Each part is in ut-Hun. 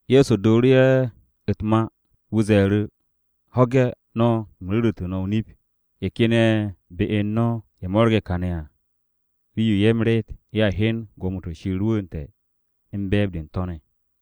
Ye̱so dooru̱ ye̱ u̱t-ma, wu̱ ze̱e̱ru̱, “Ho̱ge̱ no̱! Nip-o̱ me̱ no̱ m-ru̱re̱, ye̱ ken ye̱ be u̱n no̱ ye̱ mo̱rge̱ kane̱ à, rii-yo ye̱ meret ye̱a hyen gwo̱mo-to̱ Shir rwu̱u̱nte̱ u̱n be̱e̱b-de u̱n to̱ ne̱.”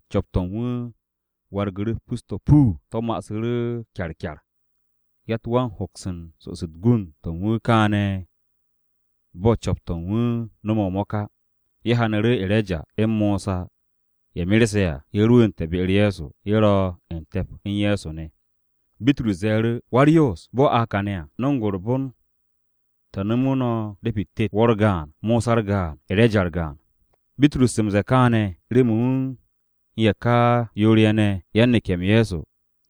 Co̱p-to̱ u̱n wu̱ wargu̱ru̱ u̱t-pus to̱ puu. To̱ ma'asu̱ru̱ kyarkyar. Yatt wan hoks u̱n so'os u̱t-gund to̱ u̱n wu̱ kane̱ bo̱ co̱p-to̱ u̱n wu̱ no̱me̱ o-mo̱k á. Ye̱ hyanu̱ru̱ E̱reja u̱n Mosa ye̱ merse̱ à, ye̱ rwu̱u̱nte̱ be-u̱r Ye̱so. Ye̱ ro̱ u̱n te̱p u̱n Ye̱so ne̱. Bitrus ze̱e̱ru̱ Ye̱so, “Wa-u̱s-Nap, bo̱ a kane̱ à, no̱ng u̱r-bon te̱ nomu̱ no̱ de̱pi-u̱t tet: wo̱ u̱r-gaan, Mosa u̱r-gaan, E̱reja u̱r-gaan.” Bitrus u̱n ze̱e̱ kaane̱ remen wu̱ u̱n ye̱ ka yoor-ye̱ ne̱ yan-neke̱-m Ye̱so,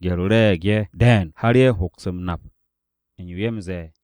gye̱r-o re̱e̱g ye̱ de̱e̱n har ye̱ hoks m-nap u̱n yo m-ze̱e̱ á.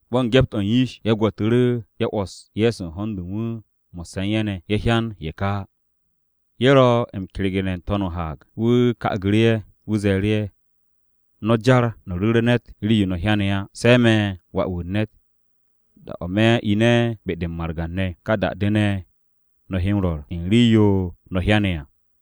Bo̱ u̱n gye̱p-o̱ u̱n yish, ye̱ gwo̱tu̱ru̱, ye̱ 'wo̱s Ye̱so u̱n ho̱n-de u̱n wu̱ mo̱sse̱ u̱n ye̱ ne̱. Ye̱ hyan ye̱ ka á. Ye̱ ro̱ m-kergene̱ n-to̱n o-haag, wu̱ ka'agu̱ru̱ ye̱. Wu̱ ze̱e̱ru̱ ye̱, “No̱ jar no̱ ru̱re̱ ne̱t rii-yo no̱ hyane̱ á. Se̱ me̱ Wà-wu̱ u̱n ne̱t, da-o̱ me̱ ine̱ be-de u̱n margan-ne̱, ka da-de ne̱, no̱ he rwo̱r u̱n rii-yo no̱ hyane̱ à.”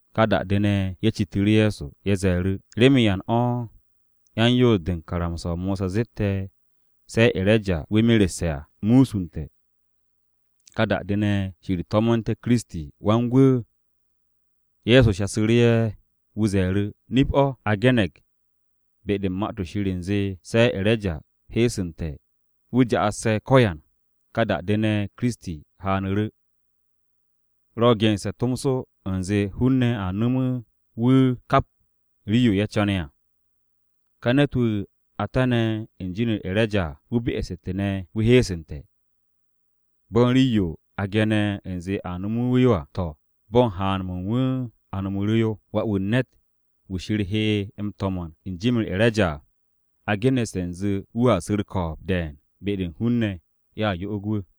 Ka da-de ne̱, ye̱ citu̱ru̱ Ye̱so. Ye̱ ze̱e̱ru̱, “¿Remen yan o̱ yan-Yoos-de u̱n karamsa-o Mosa zette̱ se E̱reja wu̱ merse̱ à, se̱ wu̱ musunte̱, ka da-de ne̱, Shir to̱mo̱nte̱ KiristiWan-Gwu̱?” Ye̱so shasu̱ru̱ ye̱, wu̱ ze̱e̱ru̱, “Nip-o̱, a ge̱ne̱g be-de u̱n Ma-to̱ Shir u̱nze se̱ E̱reja heesu̱nte̱ wu̱ ja'asse̱ ko̱yan, ka da-de ne̱, Kiristi haanu̱ru̱. Ro̱ gense̱ tomso u̱nze hun-ne̱ a nomu̱ wu̱ kap rii-yo ye̱ co̱ne̱ à. Ka ne̱t-wu̱ a tane̱ u̱n jin-u̱r E̱reja à, wu̱ be'este̱ ne̱ wu̱ heesu̱nte̱. Bo̱ u̱n rii-yo a ge̱ne̱ u̱nze a nomu̱ wu̱ yo à, to̱, bo̱ u̱n haan-mo̱ u̱n wu̱ a nomu̱ru̱ wu̱ yo. Wà-wu̱ u̱n ne̱t, wu̱ Shir he m-to̱mo̱n u̱n jim-u̱r E̱reja à, a geneste̱ u̱nze wu̱a su̱ u̱r-ko̱o̱b de̱e̱n be-de u̱n hun-ne̱, ye̱a yo'og wu̱.”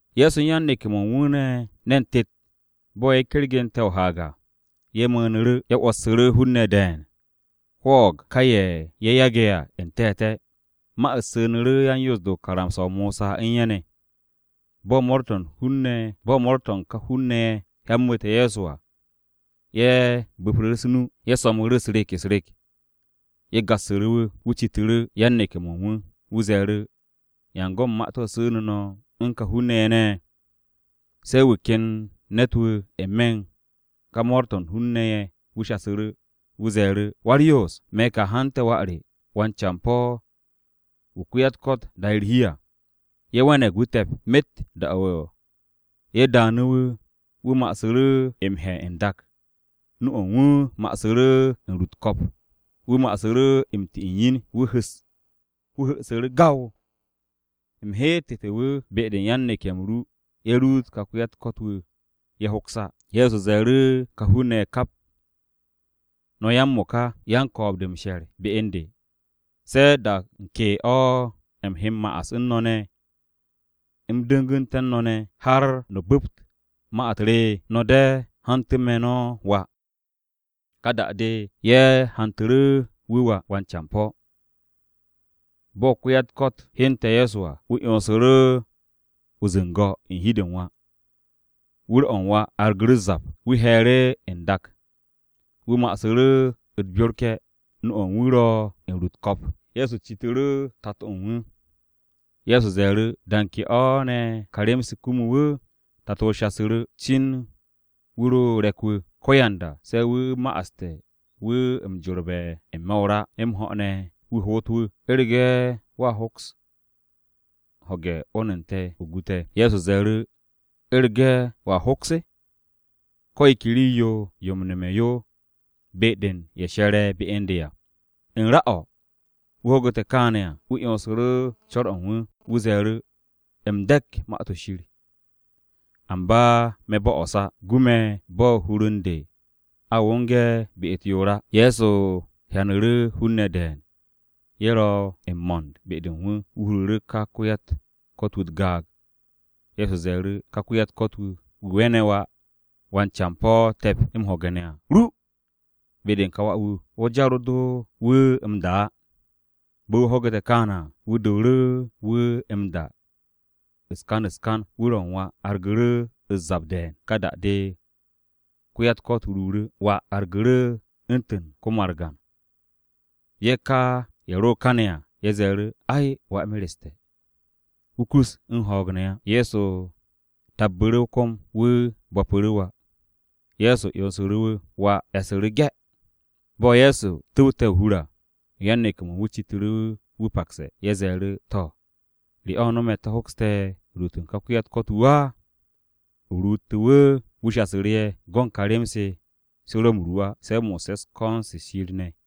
Ye̱so u̱n yan-neke̱-mo̱ u̱n wu̱ ne̱ ne̱n tet, bo̱ ye̱ kergente̱ o-haag à, ye̱ mu̱u̱nu̱ru̱. Ye̱ 'wo̱ssu̱ru̱ hun-ne̱ de̱e̱n hwo̱o̱g ká ye̱ ye̱ yage̱ à n-te̱te̱. Ma-u̱t su̱nu̱ru̱ yan-Yoos-de u̱n karamsa-o Mosa u̱n ye̱ ne̱. Bo̱ mo̱o̱r-to̱ u̱n ka hun-ne̱ ye̱ hyambu̱te̱ Ye̱so à, ye̱ bo̱pu̱ru̱ u̱s-nu. Ye̱ so̱mnu̱ru̱ u̱s-rek u̱s-rek. Ye̱ gassu̱ru̱ wu̱. Wu̱ citu̱ru̱ yan-neke̱-mo̱ u̱n wu̱, wu̱ ze̱e̱ru̱, “¿Yan go̱n ma-to̱ su̱nu̱ no̱ u̱n ka hun-ne̱ ye̱ ne̱?” Se̱ wu̱ ken ne̱t-wu̱ n-me̱ u̱n ka mo̱o̱r-to̱ u̱n hun-ne̱ ye̱ wu̱ shasu̱ru̱. Wu̱ ze̱e̱ru̱, “Wa-u̱r-Yoos, me̱ ka hante̱ wà re wan-campo̱ wu̱ ko-ya-u̱t-ko̱t da'e̱ u̱r-hi à. Ye̱ we̱ne̱g wu̱ te̱p. Myet da-o̱ ye̱ daanu̱ wu̱, wu̱ ma'asu̱ru̱ m-hye̱ n-dak, nu-o̱ u̱n wu̱ ma'asu̱ru̱ u̱n ru u̱t-ko̱p. Wu̱ ma'asu̱ru̱ u̱n ti u̱n yin, wu̱ hu̱'u̱su̱ru̱ gaw. U̱m heette̱ wu̱ be-de u̱n yan-neke̱-m ru ye̱ ruut ka ko-ya-u̱t-ko̱t-wu̱. Ye̱ hoks á.” Ye̱so ze̱e̱ru̱ ka hun-ne̱ ye̱ kap. “No̱ ya-m-mo̱ka, yan-ko̱o̱b-de m-she̱r be u̱n de! ¿Se̱ da u̱n ke o̱ u̱m he m-ma'as u̱n no̱ ne̱? ¿U̱m du̱ngu̱nte̱ u̱n no̱ ne̱, har no̱ bu̱pt ma-u̱t re? No̱ de̱, hantu̱ me̱ no̱ wà.” Ka da-de, ye̱ hantu̱ru̱ wu̱ wà, wan-campo̱. Bo̱ ko-ya-u̱t-ko̱t hyente̱ Ye̱so à, wu̱ 'yonsu̱ru̱ o-zu̱ngo̱ u̱n hi-de u̱n wà. Wu̱r-o̱ u̱n wà argu̱ru̱ u̱s-zap. Wu̱ hye̱e̱ru̱ n-dak. Wu̱ ma'asu̱ru̱ u̱t-byorke̱. Nu-o̱ u̱n wu̱ ro u̱n ru u̱t-ko̱p. Ye̱so citu̱ru̱ tato-o̱ u̱n wu̱, Ye̱so ze̱e̱ru̱, “¿Da u̱n ke o̱ ne̱ ka rem-se kumu wu̱?” Tato-o shasu̱ru̱, “Cin wu̱ ro re̱k-wu̱. Ko̱yanda se̱ wu̱ ma'aste̱ wu̱ m-jorbe̱ n-me̱ o-ra, m-ho̱ ne̱ remen wu̱ hoot wu̱. U̱rege̱ wo̱a hoks, o ho̱ge̱ 'wo̱n u̱n te̱, o gu te̱.” Ye̱so ze̱e̱ru̱, “¿‘U̱rege̱ wo̱a hoks’? Ko̱ yo ke rii-yo yo m-no̱me̱ yo be-de wu̱ she̱re̱ be u̱n de à.” U̱n ra o̱, wu̱ ho̱gu̱te̱ kaane̱ à, wu̱ 'yonsu̱ru̱ co̱r-o̱ u̱n wu̱. Wu̱ ze̱e̱ru̱, “U̱m de̱k Ma-to̱ Shir. Amba me̱ bo'os á. Gu me̱ bo̱ hur-u̱r u̱n de a wonge̱ be-u̱t yoor á.” Ye̱so hyanu̱ru̱ hun-ne̱ de̱e̱n ye̱ ro̱ m-mo̱nd be-de u̱n wu̱. Wu̱ huru̱ru̱ ka ko-ya-u̱t-ko̱t-wu̱ u̱t-gaag. Ye̱so ze̱e̱ru̱, “Ka ko-ya-u̱t-ko̱t-wu̱, wu̱ we̱ne̱ wà wan-campo̱ te̱p m-ho̱ge̱ ne̱ à, ru be-de u̱n kà wà-wu̱. Wo̱ jar do wu̱ m-da á.” Bo̱ wu̱ ho̱gu̱te̱ kaane̱ à, wu̱ dooru̱ wu̱ m-da u̱s-kan u̱s-kan. Wu̱r-o̱ u̱n wà argu̱ru̱ u̱s-zap de̱e̱n. Ka da-de, ko-ya-u̱t-ko̱t ruuru̱. Wà wargu̱ru̱ u̱ntu̱n ko-margan. Ye̱ ka ye̱ ro kane̱ à, ye̱ ze̱e̱ru̱, “Ay, wà mereste̱. Wu̱ kus u̱n ho̱o̱g ne̱ á.” Ye̱so tabbu̱ru̱ o-kom. Wu̱ bo̱pu̱ru̱ wà. Ye̱so 'yonsu̱ru̱ wu̱. Wà e̱su̱ru̱ ge̱. Bo̱ Ye̱so tu̱wte̱ o-hur à, yan-neke̱-mo̱ u̱n wu̱ citu̱ru̱ wu̱ pakse̱. Ye̱ ze̱e̱ru̱, “To̱, ¿re o̱ no̱me̱ te̱ hokste̱ ruut u̱n ka ko-ya-u̱t-ko̱t-wu̱ á, o ruutte̱ wu̱?” Wu̱ shasu̱ru̱ ye̱, “Go̱n ka rem-se se ro̱ m-ru á, se̱ mo̱sse̱ u̱n ko̱n-se u̱n Shir ne̱.”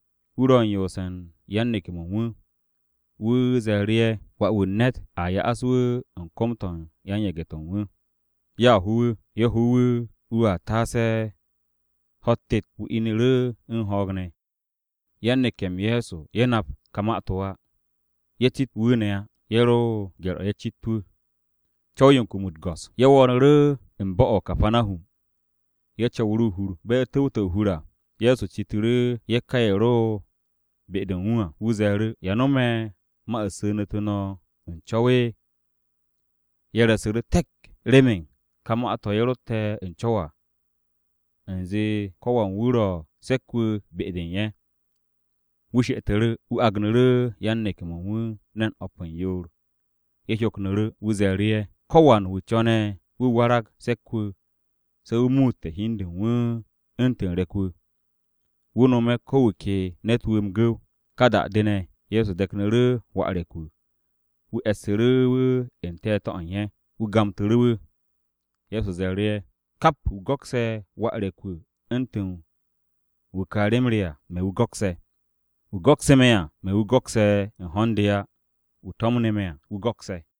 Wu̱ ro u̱n yoose̱ u̱n yan-neke̱-mo̱ u̱n wu̱. Wu̱ ze̱e̱ru̱ ye̱, “Wà-wu̱ u̱n ne̱t, a ya'as wu̱ u̱n kom-to̱ u̱n yan-yage̱-to̱ u̱n wu̱. Ye̱a ho wu̱. Ye̱ ho wu̱, wu̱ taase ho̱-u̱t tet, wu̱ inu̱ru̱ u̱n ho̱o̱g ne̱.” Yan-neke̱-m Ye̱so ye̱ nap ka ma-to̱ á. Ye̱ cit wu̱ ne̱ á. Ye̱ ro o-gye̱r ye̱ cit wu̱. Ye̱ wo̱o̱nu̱ru̱ u̱n bo̱-o̱ o-Kapanahum. Ye̱ co̱wu̱ru̱ o-hur. Bo̱ ye̱ tu̱wte̱ o-hur à, Ye̱so citu̱ru̱ ye̱ ka ye̱ ro be-de u̱n wu̱ à. Wu̱ ze̱e̱ru̱, “¿Ya no̱me̱ ma-u̱t su̱nu̱tu̱ no̱ u̱n co̱w?” Ye̱ re̱su̱ru̱ te̱k remen ka ma-to̱ ye̱ rotte̱ u̱n co̱w à, u̱nze ko̱ wan wu̱ ro̱ se̱k-wu̱ be-de u̱n ye̱. Wu̱ she'etu̱ru̱. Wu̱ agnu̱ru̱ yan-neke̱-mo̱ u̱n wu̱ ne̱n o̱p u̱n yoor. Ye̱ hyoknu̱ru̱. Wu̱ ze̱e̱ru̱ ye̱, “Ko̱wan wu̱ co̱ne̱ wu̱ warag se̱k-wu̱, se̱ wu̱ muutte̱ hi u̱n de u̱n wu̱ u̱ntu̱n re̱k-wu̱, wu̱ nome̱ ko̱ wu̱ ke ne̱t-wu̱ m-gu̱w.” Ka da-de ne̱, Ye̱so de̱knu̱ru̱ wà re̱k-wu̱, wu̱ e̱ssu̱ru̱ wu̱ n-te̱te̱ o̱ u̱n ye̱. Wu̱ gamtu̱ru̱ wu̱. Ye̱so ze̱e̱ru̱ ye̱, “Kap wu̱ go̱kse̱ wà re̱k-wu̱ u̱ntu̱n wu̱ ka rem re à, me̱ wu̱ go̱kse̱. Wu̱ go̱kse̱ me̱ à, me̱ wu̱ go̱kse̱ u̱n ho̱n-de á. Wu̱ to̱mne̱ me̱ à, wu̱ wu̱ go̱kse̱.”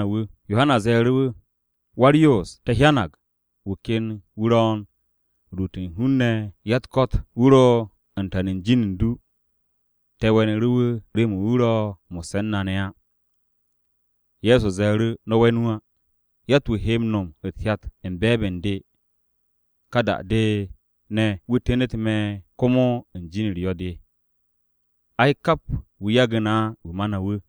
Yohana ze̱e̱ru̱ wu̱, “Wa-u̱r-Yoos, te̱ hyanag wu̱ ken wu̱ ro̱ u̱n ruute̱ u̱n hun-ne̱ ko-ya-u̱t-ko̱t, wu̱ ro̱ u̱n tan u̱n jin u̱n du. Te̱ we̱nu̱ru̱ wu̱ remen wu̱ ro̱ mo̱sse̱ u̱n na ne̱ á.” Ye̱so ze̱e̱ru̱, “No̱ we̱n wu̱ á. Yatt-wu̱ he no̱m u̱t-hyat u̱n be̱e̱b u̱n de, ka da-de ne̱, wu̱ tenet me̱ komo u̱n jin-u̱r yo̱-de á. Ay, kap wu̱ yage̱ na á, wu̱ ma na wu̱.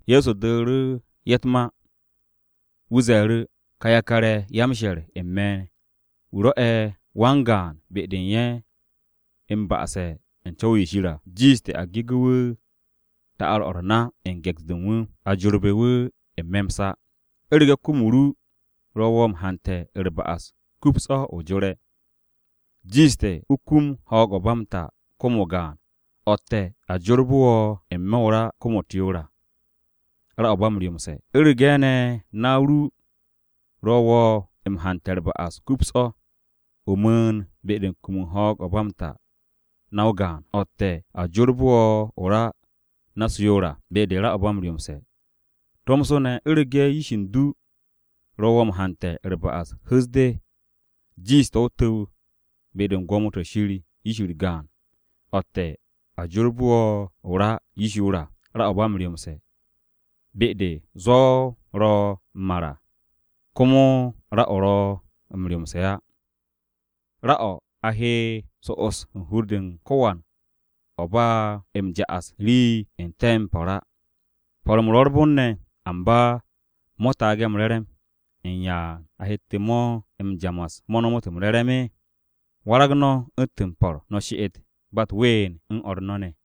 Ye̱so dooru̱ ye̱ u̱t-ma. Wu̱ ze̱e̱ru̱, “Ka yakar-ye̱, ya-m-she̱r u̱n me̱, wu̱ rwo̱'e̱ wan-gaan be-de u̱n ye̱, m-ba'ase̱ u̱n co̱w-yo Shir à, jiishte̱ a gegu̱ wu̱ ta'ar-o̱ u̱r-na u̱n ge̱ks-de u̱n wu̱, a jorbe̱ wu̱ n-me̱ m-sa. U̱rege̱ kom-o ru ro̱ wo̱ m-hante̱ u̱r-ba'as, kups o̱ o jore̱. Jiishte̱ o kum ho̱o̱g-o̱ u̱n ba m-ta kom-o gaan, o̱tte̱ a jorbe̱ wo̱ n-me̱ den-o̱ o-ra kom-u̱t yoor à, ra-o̱ ba m-ryomse̱. U̱rege̱ ne̱ na-o ru ro̱ wo̱ m-hante̱ u̱r-ba'as, kups o̱. O mu̱u̱n be-de u̱n kum u̱n ho̱o̱g-o̱ ba m-ta na-o gaan, o̱tte̱ a jorbe̱ wo̱ den-o̱ o-ra na-u̱s yoor à, be-de ra-o̱ ba m-ryomse̱. Tomso u̱rege̱ yish u̱n du ro̱ wo̱ m-hante̱ u̱r-ba'as, hu̱s de. Jiishte̱ o tu̱w be-de u̱n gwo̱mo-to̱ Shir yish-u̱r gaan, o̱tte̱ a jorbe̱ wo̱ den-o̱ o-ra yish yoor à, ra-o̱ ba m-ryomse̱. Be-de, ‘Zwo̱ ro̱ m-mar à, komo ra-o ro̱ m-ryomse̱ á.’ O-ra o̱, a he so'os u̱n hur-de u̱n ko̱wan bo̱ a m-ja'as u̱n rii n-te̱ m-po̱r à. “Po̱r-m ro̱ u̱r-bon ne̱, amba mo̱ taage̱ m-re̱re̱m, ¿u̱n yan a hette̱ mo̱ m-ja'as mo̱ nomot m-re̱re̱m? Warag no̱ u̱ntu̱n m-po̱r, no̱ she'et ba u̱t-ween u̱n o̱r no̱ ne̱.”